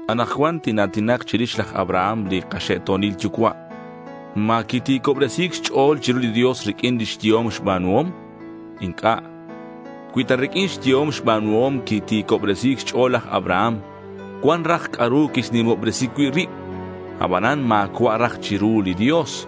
Anakcuan tina̱tinak chirix laj Abraham li kaxe'to̱nil yucua'. ¿Ma quiti̱cobresi̱c xch'o̱l chiru li Dios riq'uin lix yehom xba̱nuhom? Inc'a'. Cui ta riq'uin xyehom xba̱nuhom quiti̱cobresi̱c xch'o̱l laj Abraham, cuan raj c'a'ru quixnimobresi cui' rib. Abanan ma̱cua' raj chiru li Dios.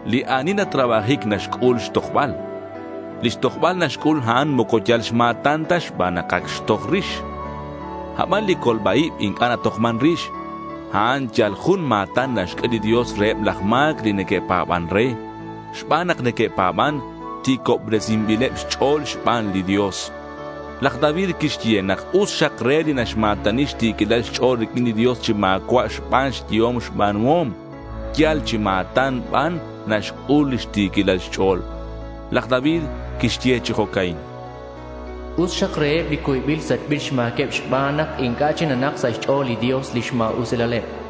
Li ani natrabajic naxc'ul xtojbal. Lix tojbal naxc'ul a'an moco yal xma̱tan ta xban nak ac xtoj rix. Aban li colba-ib inc'a' natojman rix. A'an yal jun ma̱tan naxq'ue li Dios reheb laj ma̱c li neque'pa̱ban re. Xban nak neque'pa̱ban, ti̱cobresinbileb xch'o̱l xban li Dios. Laj David quixye nak us xak re li naxma̱tani xti̱quilal xch'o̱l riq'uin li Dios chi ma̱cua' xban xyehom xba̱nuhom. Yal chi ma̱tan ban naxc'ul lix ti̱quilal xch'o̱l. Laj David quixye chi jo'ca'in: Us xak reheb li cuybil sachbil xma̱queb, xban nak inc'a' chic nanak sa' xch'o̱l li Dios lix ma̱usilaleb.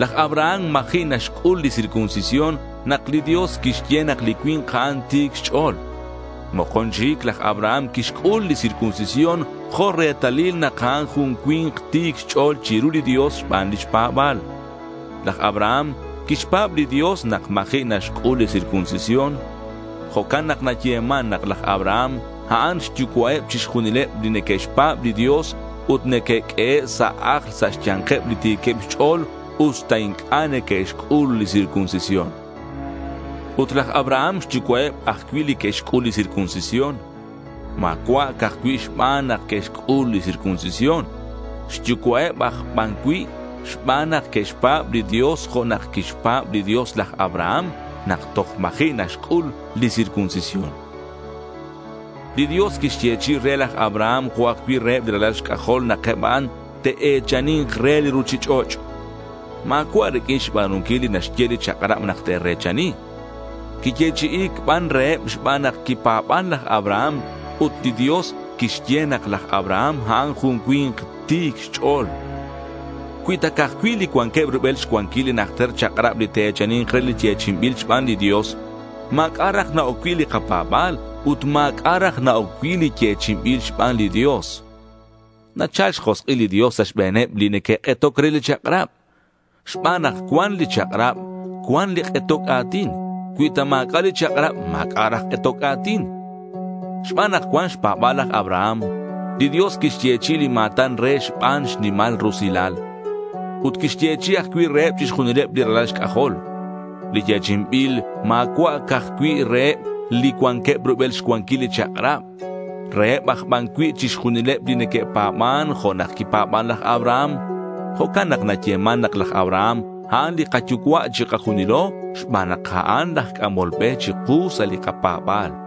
Laj Abraham ma̱ji' naxc'ul li circuncisión nak li Dios quixye nak li cui̱nk a'an ti̱c xch'o̱l. Mokon chic laj Abraham quixc'ul li circuncisión jo' retalil nak a'an jun cui̱nk ti̱c xch'o̱l chiru li Dios xban lix pa̱ba̱l. Laj Abraham quixpa̱b li Dios nak ma̱ji' naxc'ul li circuncisión. Jo'can nak nayeman nak laj Abraham a'an xyucua'eb chixjunileb li neque'xpa̱b li Dios ut neque'q'uehe' sa' ajl sa' xya̱nkeb li ti̱queb xch'o̱l usta inc'a' neque'xc'ul li circuncisión. Ut laj Abraham xyucua'eb ajcui' li que'xc'ul li circuncisión. Ma̱cua' ca'aj cui' xban nak que'xc'ul li circuncisión. Xyucua'eb aj ban cui' xban nak que'xpa̱b li Dios jo' nak quixpa̱b li Dios laj Abraham nak toj ma̱ji' naxc'ul li circuncisión. Li Dios quixyechi'i re laj Abraham jo' ajcui' reheb li ralal xc'ajol nak eb a'an te'e̱chani̱nk re li ruchich'och'. Ma̱cua' riq'uin xba̱nunquil li naxye li chak'rab nak te're̱chani. Quiyechi'i̱c ban reheb xban nak quipa̱ban laj Abraham ut li Dios quixye nak laj Abraham a'an jun cui̱nk ti̱c xch'o̱l. Cui ta ca'aj cui' li cuanqueb rubel xcuanquil li najter chak'rab li te'e̱chani̱nk re li yechi'inbil xban li Dios, ma̱c'a' raj na-oc cui' li kapa̱ba̱l. Ut ma̱c'a' raj na-oc cui' li yechi'inbil xban li Dios. Nachal xjosk'il li Dios sa' xbe̱neb li neque'k'etoc re li chak'rab. Xban nak cuan li chak'rab, cuan li k'etoc a̱tin. Cui ta ma̱c'a' li chak'rab, ma̱c'a' raj k'etoc a̱tin. Xban nak cuan xpa̱ba̱l laj Abraham, li Dios quixyechi'i li ma̱tan re xban xnimal rusilal. Ut quixyechi'i ajcui' reheb chixjunileb li ralal xc'ajol. Li yechi'inbil ma̱cua' ca'aj cui' reheb li cuanqueb rubel xcuanquil li chak'rab. Reheb aj ban cui' chixjunileb li neque'pa̱ban jo' nak quipa̱ban laj Abraham. Jo'can nak nayeman nak laj Abraham a'an li kayucua' chikajunilo xban nak a'an laj c'amol be chiku sa' li kapa̱ba̱l.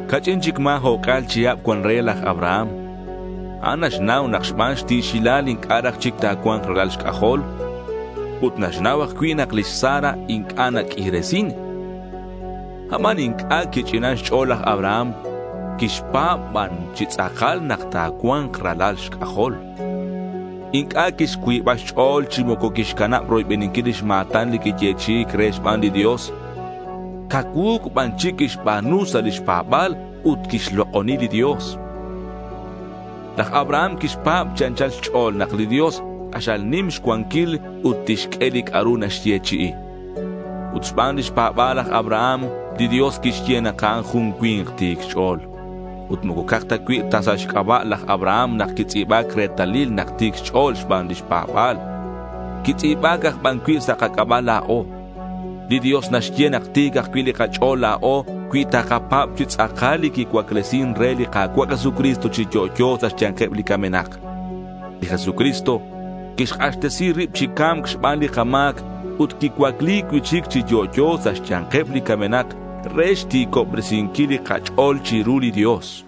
Ca'ch'in chic ma̱ o'c'a̱l chihab cuan re laj Abraham. A'an naxnau nak xban xti̱xilal inc'a' raj chic ta̱cua̱nk ralal xc'ajol. Ut naxnau ajcui' nak lix Sara inc'a' naq'uiresin. Aban inc'a' quich'inan xch'o̱l laj Abraham. Quixpa̱b ban chi tz'akal nak ta̱cua̱nk ralal xc'ajol. Inc'a' quixcuiba xch'o̱l chi moco quixcanab roybeninquil lix ma̱tan li quiyechi'i̱c re xban li Dios. Cacuu̱c ban chic quixba̱nu sa' lix pa̱ba̱l ut quixlok'oni li Dios. Laj Abraham quixpa̱b chi anchal xch'o̱l nak li Dios k'axal nim xcuanquil ut tixq'ue li c'a'ru naxyechi'i. Ut xban lix pa̱ba̱l laj Abraham, li Dios quixye nak a'an jun cui̱nk ti̱c xch'o̱l. Ut moco ca'aj cui' ta sa' xc'aba' laj Abraham nak quitz'i̱ba̱c retalil nak ti̱c xch'o̱l xban lix pa̱ba̱l. Quitz'i̱ba̱c aj ban cui' sa' kac'aba' la̱o. Li Dios naxye nak ti̱c ajcui' li kach'o̱l la̱o cui takapa̱b chi tz'akal li quicuaclesin re li Ka̱cua' Jesucristo chi yo'yo sa' xya̱nkeb li camenak. Li Jesucristo quixk'axtesi rib chi ca̱mc xban li kama̱c ut quicuacli cui'chic chi yo'yo sa' xya̱nkeb li camenak re xti̱cobresinquil li kach'o̱l chiru li Dios.